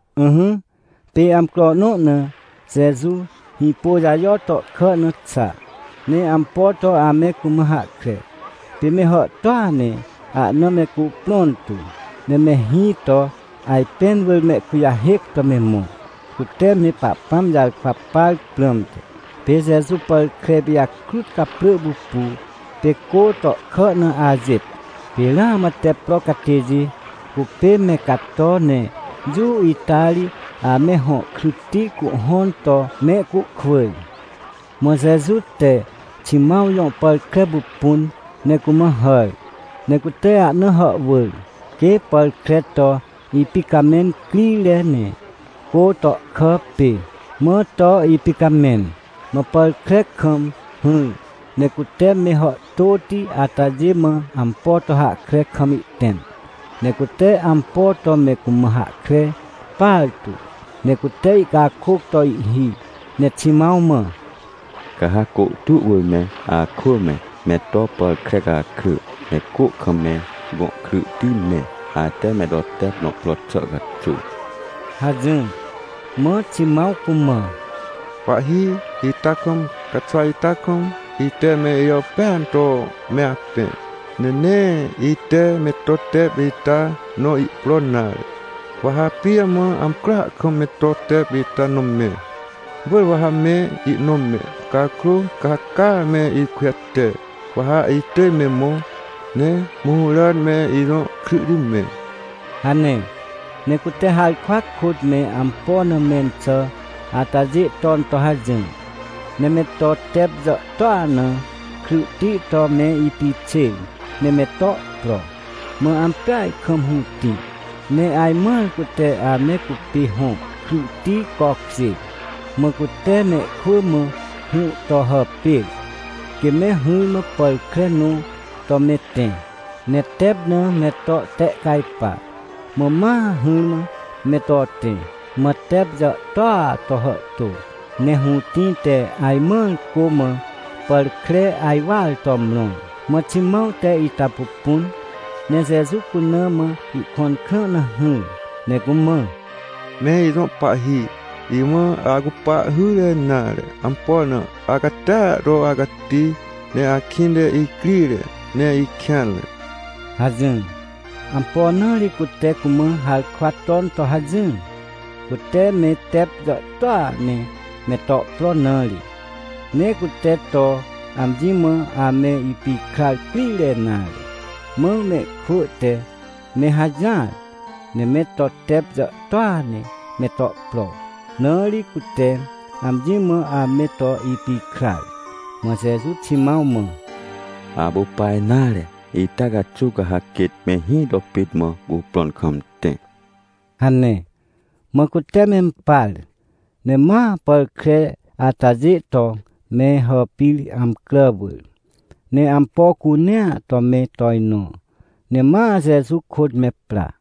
Ỹhỹ, pê amcro nõ na Jeju Hĩpôjajo tohkà na xa, ne ampo to ame cumã hahkre. Pê me hàhtôa ne ahna me cuprõn tu, ne me hĩ to ajpẽn wỳr mehkujahêc to me mõ, cute me Pahpãm jarkwa par prãmte. Pê Jeju pàr kre pijakrut caprỳ pupu, pê cô tohkà na ajêt. Pê ramã tep pro catêjê cupê me cato ne jũ ita ri ame hõ kryhti cuhhõn to mehcuhkwỳr. Mã Jeju te Ximãw jõ pàr kre pupun ne cumã hàr, ne cute ahna hàhwỳr, quê pàr kre to ipicamẽn crire ne, cô tohkà pê. Mã to ipicamẽn. Mã pàr kre kam hỹr, ne cute me hàhtôti atajê mã ampo to hahkre kam ihtẽm. Ne cute ampo to me cumã hahkre partu, ne cute ihcakôc to ihhi, ne Ximãw mã: ― Ca ha côhtu wỳr me akwỳ me, me to pàr kre cakrỳ ne cô kam me gõ kryhti mẽ, ate me to tep nõ pro xà caxuw ― hajỹr. Mã Ximãw cumã: ― Pahhi, ita kam, caxwa ita kam, ite me ijàpêan to me apẽ, ne nee ite me to tep ita nõ ihpro nare. Wa ha pijamã amcroa kam me to tep ita nõ mẽ? Wỳr wa ha me ihnõ mẽ! Cakrô ca ha caa me ikujate, wa ha itỳj me mõ, ne mũhũràn me ijõ kryhti mẽ ― hane. Ne cute harkwa kôt me ampo na mẽn xà atajê ton to hajỹr, ne me to tep jàhtôa na kryhti to me ipixêr, ne me to pro. Mã ampeaj kam hũtĩ, ne ajmãr cute ame cupê hõ kryhti cokjêr. Mã cute mehkwỳ mã hũ to hàpêr, quê me hỹrmã pàr kre nõ to me tẽ, ne tep na me to ihtehcajpa. Mã ma hỹrmã me to tẽ. Mã tep jàhtôa to hàhtô, ne hũtĩ te ajmãr cô mã pàr kre ajwar to mrõr. Mã Ximãw te ita pupun, ne Jeju cuna mã ihkõn krã na hỹr, ne cumã: ― Me ijõ Pahhi, imã acupa hyre nare. Ampo na? Acatia to acati ne akĩnte icrire, ne ikêanre ― hajỹr. Ampo na ri cute cumã harkwa ton to hajỹr? Cute me tep jàhtôa ne me to pro na ri, ne cute to amji mã ame ipikrar crire nare. Mã mehkwỳ te me hajỹar, ne me to tep jàhtôa ne me to pro, na ri cute amji mã ame to ipikrar. Mã Jeju Ximãw mã: ― Apu pa nare. Ita caxuw ca ha quêt mehĩ to pit mã cuprõn kam tẽ ― hane. Mã cute mempar. Ne ma pàr kre atajê to me hàpir amcrà wỳr, ne ampo cunea to me tojnõ, ne ma Jeju kôt me pra.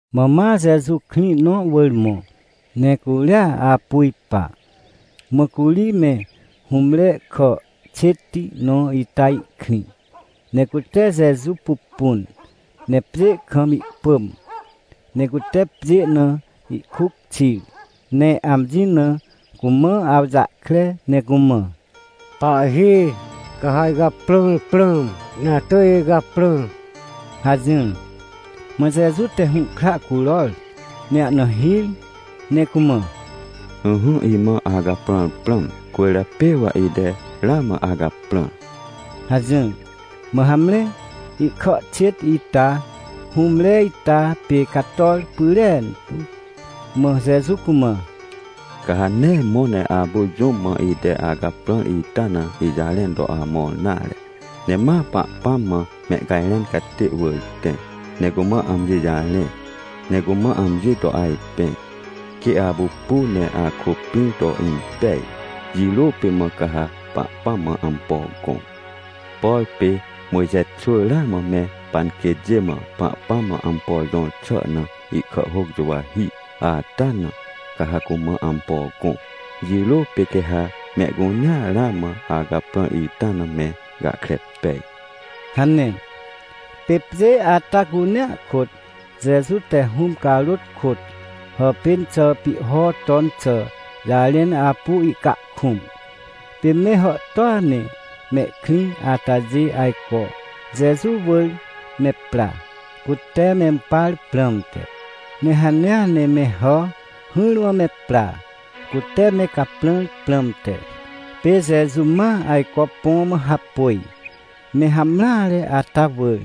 Mã ma Jeju krĩ nõ wỳr mõ, ne curia apu ipa. Mã curi me hũmre kà xêtti nõ ita ihkrĩ. Ne cute Jeju pupun, ne pjê kam ihpỳm, ne cute pjê na ihkuc xir ne amji na cumã awjahkre, ne cumã: ― Pahhi, ca ha icaprãr prãm, ne atỳj icaprã ― hajỹr. Mã Jeju te hũhkra curor ne ahna hir ne cumã: ― Ỹhỹ, imã acaprãr prãm, cwỳrjapê wa ite ramã acaprãr ― hajỹr. Mã hamre, ihkà xêt ita hũmre ita pê cator pyrentu. Mã Jeju cumã: ― Ca ha nee mõ ne apu jũm mã ite acaprãr ita na ijarẽn to amõr nare, ne ma Pahpãm mã mehcajrẽn catê wỳr tẽ, ne cumã amji jarẽ, ne cumã amji to ajpẽ, quê apupu ne akôpĩr to impej. Jirô pê mã ca ha Pahpãm mã ampo gõ. Por pê Mojxe xwỳ ramã me panquêtjê mã Pahpãm mã ampo jõr xà na ihkàhhôc juwahi ata na, ca ha cumã ampo gõ. Jirô pê quê ha mehcunea ramã acaprãr ita na me gahkre pej ― hane. Pê pjê ata cunea kôt Jeju te Hũm carôt kôt hàpên xà pihho ton xà jarẽn apu ihcahkũm. Pê me hàhtôa ne mehkrĩ atajê ajco Jeju wỳr me pra, cute mempar prãmte. Ne hanea ne me hà hỹrmã me pra, cute me caprãr prãmte. Pê Jeju ma ajco põ mã hapôj, me hamreare ata wỳr,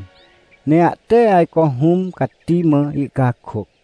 ne ahte ajco Hũm Cati mã ihcakôc.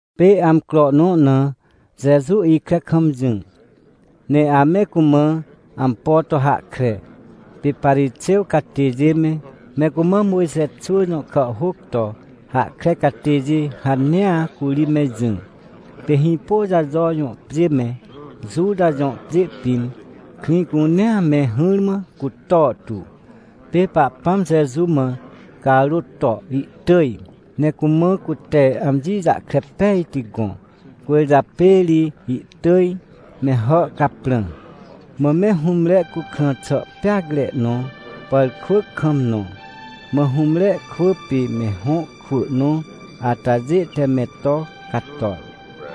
Pê amcro nõ na Jeju ikre kam jỹ, ne ame cumã ampo to hahkre. Pê Parixêw catêjê me, me cumã Mojxe xwỳ jõ kàhhôc to hahkre catêjê hanea curi me jỹ. Pê Hĩpôjajo jõ pjê me, Juta jõ pjê pĩn, krĩ cunea me hỹrmã cutor tu. Pê Pahpãm Jeju mã carôt to ihtỳj, ne cumã cute amji jahkre pejti gõ, cwỳrjapê ri ihtỳj me hà caprã. Mã me hũmre cukrã xà peacre nõ pàrkwỳc kam nõ. Mã hũmre kwỳ pê me hõ kwỳ nõ atajê te me to cator,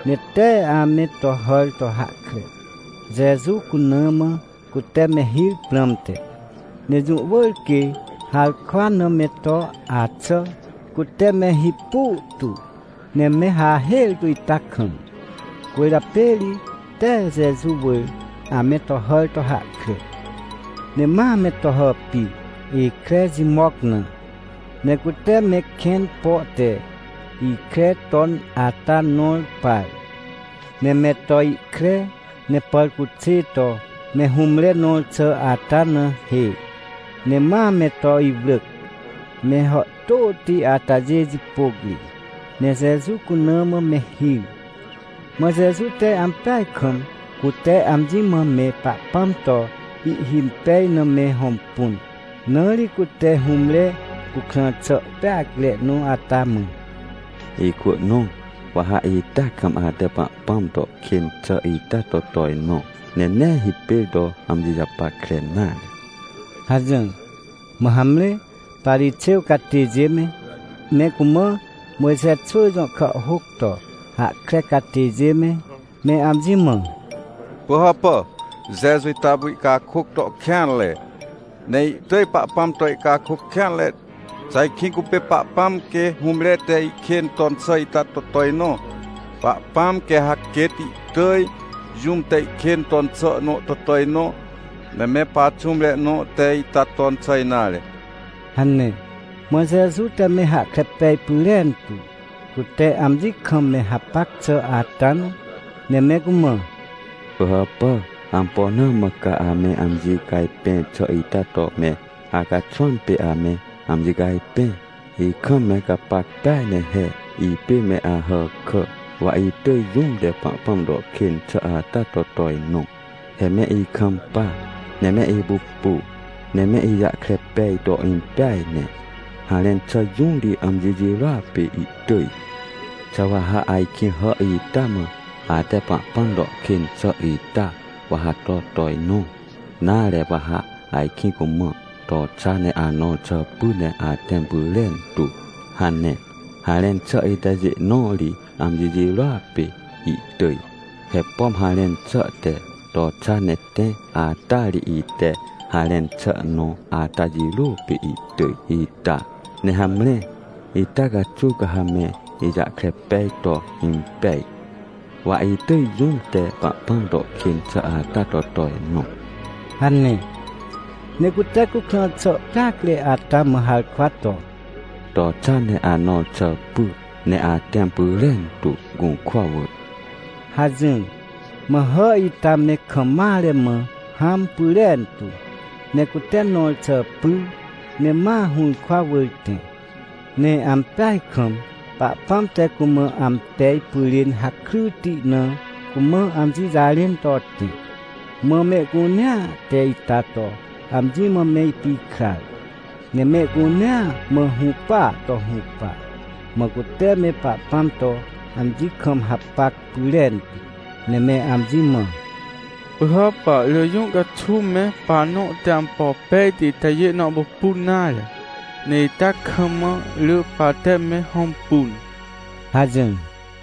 ne tee ame to hàr to hahkre, Jeju cuna mã cute me hir prãmte. Ne jũ wỳr quê harkwa na me to axà, cute me hipu tu, ne me hahêr tu ita kam. Cwỳrjapê ri tee Jeju wỳr ame to hàr to hahkre. Ne ma me to hàpir, ikre jimoc na. Ne cute me kẽn po te ikre ton ata nõr par, ne me to ihkre, ne pàrcuxê to me hũmre nõr xà ata na hê, ne ma me to iwrỳc, me hàhtôti atajê jipôc ri, ne Jeju cuna mã me hir. Mã Jeju te ampeaj kam, cute amji mã me Pahpãm to ihhimpej na me hõmpun, na ri cute hũmre cukrã xà peacre nõ ata mã: ― Ikwỳ nõ, wa ha ita kam ate Pahpãm to kên xà ita to tojnõ, ne nee hipêr to amji japackre nare ― hajỹr. Mã hamre, Parixêw catêjê me, me cumã Mojxe xwỳ jõ kàhhôc to hahkre catêjê me, me amji mã: ― Pỳhàpà, Jeju ita apu ihcakôc to kêanre. Ne ihtỳj Pahpãm to ihcakôc kêanre. Xà ajkĩ cupê Pahpãm, quê hũmre te ihkên ton xà ita to tojnõ? Pahpãm quê ha quêt ihtỳj jũm te ihkên ton xà nõ to tojnõ, ne me paxũmre nõ te ita ton xà nare ― hane. Mã Jeju te me hahkre pej pyrentu, cute amji kam me hapac xà ata na, ne me cumã: ― Pỳhàpà, ampo na mã ca ame amji cajpẽr xà ita to me acaxwãm pê ame amji cajpẽ? Ikam me gapac peaj ne he. Ipê me Ahàkà, wa itỳj jũm te Pahpãm to kên xà ata to tojnõ. He me ikampa, ne me ipupu, ne me ijahkre pej to impeaj ne. Harẽn xà jũ ri amji jirôa pê ihtỳj? Xà wa ha ajkĩ hà ita mã: “Ate Pahpãm to kên xà ita, wa ha to tojnõ?” nare, wa ha ajkĩ cumã: “To xa ne anõr xà py ne atẽm pyrentu?” hane. Harẽn xà itajê nõ ri amji jirôa pê ihtỳj? He pom harẽn xà te: “To xa ne tẽ” ata ri, ite harẽn xà nõ ata jirôa pê ihtỳj ita? Ne hamre, ita caxuw ca ha me ijahkre pej to impej, wa itỳj jũm te Pahpãm to kên xà ata to tojnõ ― hane. Ne cute cukrã xà peacre ata mã harkwa to: ― To xa ne anõr xà py, ne atẽm pyrentu, gũrkwa wỳr ― hajỹr. Mã hà ita me kam mare mã hãm pyrentu, ne cute nõr xà pyr, ne ma hũrkwa wỳr tẽ. Ne ampeaj kam Pahpãm te cumã ampej pyrên hakryti na cumã amji jarẽn to tẽ. Mã mehcunea te ita to amji mã me ipikrar, ne mehcunea mã hũpaa to hũpa. Mã cute me Pahpãm to amji kam hapac pyrentu, ne me amji mã: ― Pỳhàpà, rỳ jũ caxuw me pahnõ te ampo pejti itajê nõ pupun nare, ne ita kam mã rỳ pahte me hõmpun ― hajỹr.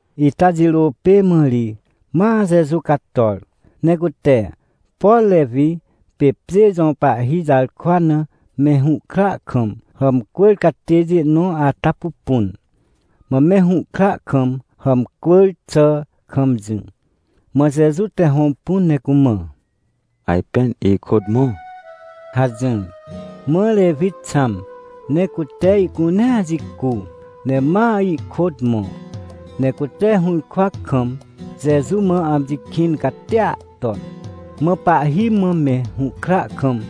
Ita jirô pê mã ri ma Jeju cator, ne cute, por Rewi pê pjê jõ pahhi jarkwa na me hũhkra kam hàmcwỳr catêjê nõ ata pupun. Mã me hũhkra kam hàmcwỳr xà kam jỹ, mã Jeju te hõmpun ne cumã: ― Ajpên ikôt mõ ― hajỹr. Mã Rewi xãm ne cute ihcunea jicu, ne ma ihkôt mõ. Ne cute hũrkwa kam, Jeju mã amji kĩn catia ton. Mã pahhi mã me hũhkra kam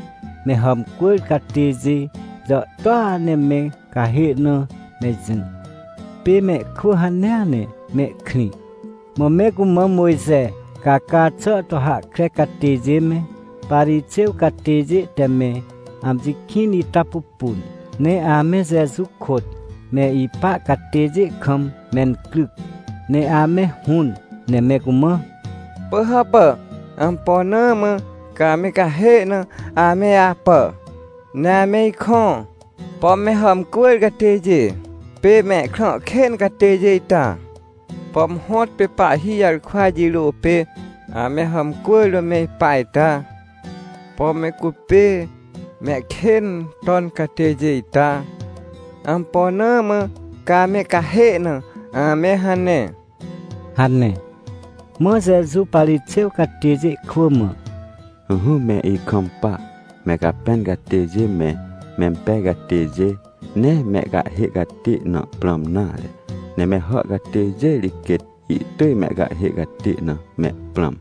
me hàmcwỳr catêjê jàhtôa ne me cahê na me jỹ. Pê mehkwỳ hanea ne mehkrĩ. Mã me cumã Mojxe caca xà to hahkre catêjê me, Parixêw catêjê te me amji kĩn ita pupun. Ne ame Jeju kôt me ipa catêjê kam mencryc, ne ame hũn, ne me cumã: ― Pỳhàpà, ampo na mã ca ame cahê na ame apà, ne ame ikõ? Pom me hàmcwỳr catêjê pê mehkrã kên catêjê ita? Pom hõtpê pahhi jarkwa jirôa pê ame hàmcwỳr to me ipa ita? Pom me cupê mehkên ton catêjê ita? Ampo na mã ca me cahê na ame hane? ― hane. Mã Jeju Parixêw catêjê kwỳ mã: ― Ỹhỹ, me ikampa! Me capẽn catêjê me, mempej catêjê, nee mehcahhê catê na prãm nare. Ne me hà catêjê ri quêt ihtỳj mehcahhê catê na mehprãm.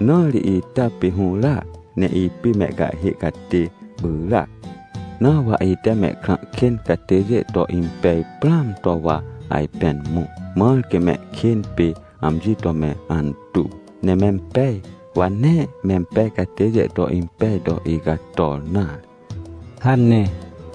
Na ri ita pê hũràc ne ipê mehcahhê catê pyràac. Na wa ite mehkrã kên catêjê to impej prãam to wa ajpên mõ, mãr quê mehkên pê amji to me antuw, ne mempej. Wa nee mempej catêjê to impej to icator nare ― hane.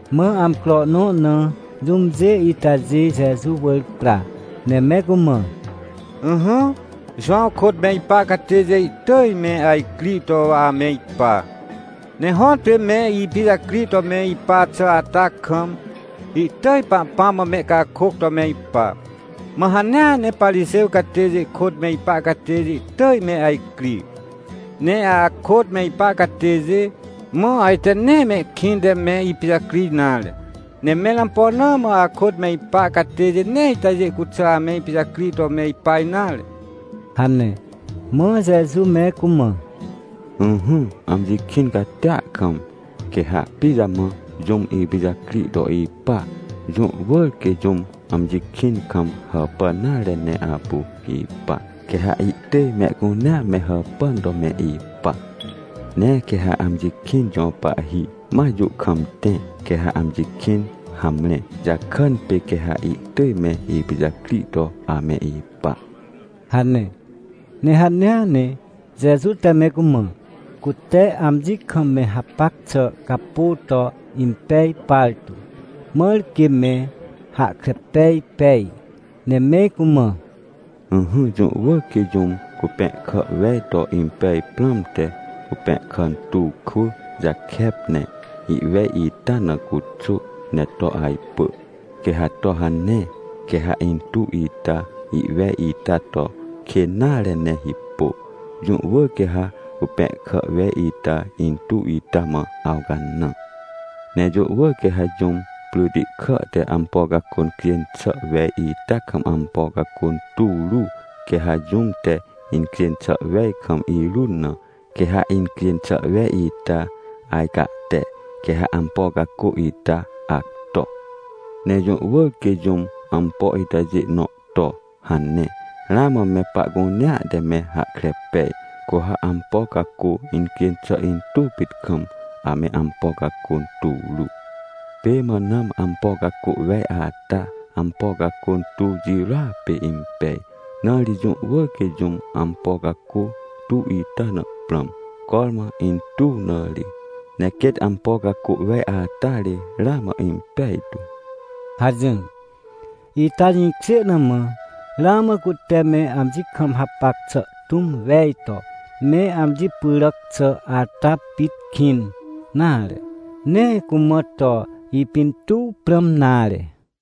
Mã amcro nõ na jũmjê itajê Jeju wỳr pra, ne me cumã: ― Ỹhỹ, Jowãw kôt me ipa catêjê ihtỳj me ajcri to ame ipa, ne hõtpê me ipijacri to me ipa xà ata kam, ihtỳj Pahpãm mã mehcakôc to me ipa. Mã hanea ne Parixêw catêjê kôt me ipa catêjê ihtỳj me ajcri. Ne akôt me ipa catêjê, mã ajte nee mehkĩnte me ipijacri nare. Ne mẽr ampo na mã akôt me ipa catêjê nee itajê cuxà ame ipijacri to me ipa nare? ― hane. Mã Jeju me cumã: ― Ỹhỹ, amji kĩn catia kam, quê ha pijamã jũm ipijacri to ipa? Jũ wỳr quê jũm amji kĩn kam hàpàn nare ne apu ipa. Quê ha ihtỳj mehcunea me hàpàn to me ipa. Ne quê ha amji kĩn jõ pahhi ma jũ kam tẽ, quê ha amji kĩn hamre, jakàn pê quê ha ihtỳj me ipijacri to ame ipa ― hane. Ne hanea ne Jeju te me cumã, cute amji kam me hapac xà capô to impej partu, mãr quê me hahkre pej pej, ne me cumã: ― Ỹhỹ, jũ wỳr quê jũm cupẽhkà wej to impej prãmte, cupẽhkà tuw kwỳ jakep, ne ihwej ita na cuxô ne to ajpỳ. Quê ha to hane, quê ha intuw ita ihwej ita to kên nare ne hipô, jũ wỳr quê ha cupẽhkà wej ita intuw ita mã awcanã. Ne jũ wỳr quê ha jũm pryti kà te ampo cacô cjên xà wej ita kam ampo cacô tuw ru. Quê ha jũm te incjêj xà wej kam irun na, quê ha incjên xà wej ita ajcahte, quê ha ampo cacô ita acto. Ne jũ wỳr quê jũm ampo itajê nõ to hane, ramã me pahcunea te me hahkre pej. Cu ha ampo cacô incjên xà intuw pit kam ame ampo cacô tuw ru. Pê mã nãm ampo cacô wej ata, ampo cacô tuw jirôa pê impej. Na ri jũ wỳr quê jũm ampo cacô tuw ita na prãm, cormã intuw na ri, ne quêt ampo cacô wej ata ri ramã impejtu ― hajỹr. Ita jĩkjê na mã, ramã cute me amji kam hapac xà tũm wej to me amji pyràc xà ata pit kĩn, nare, nee cumã to ipintuw prãm nare.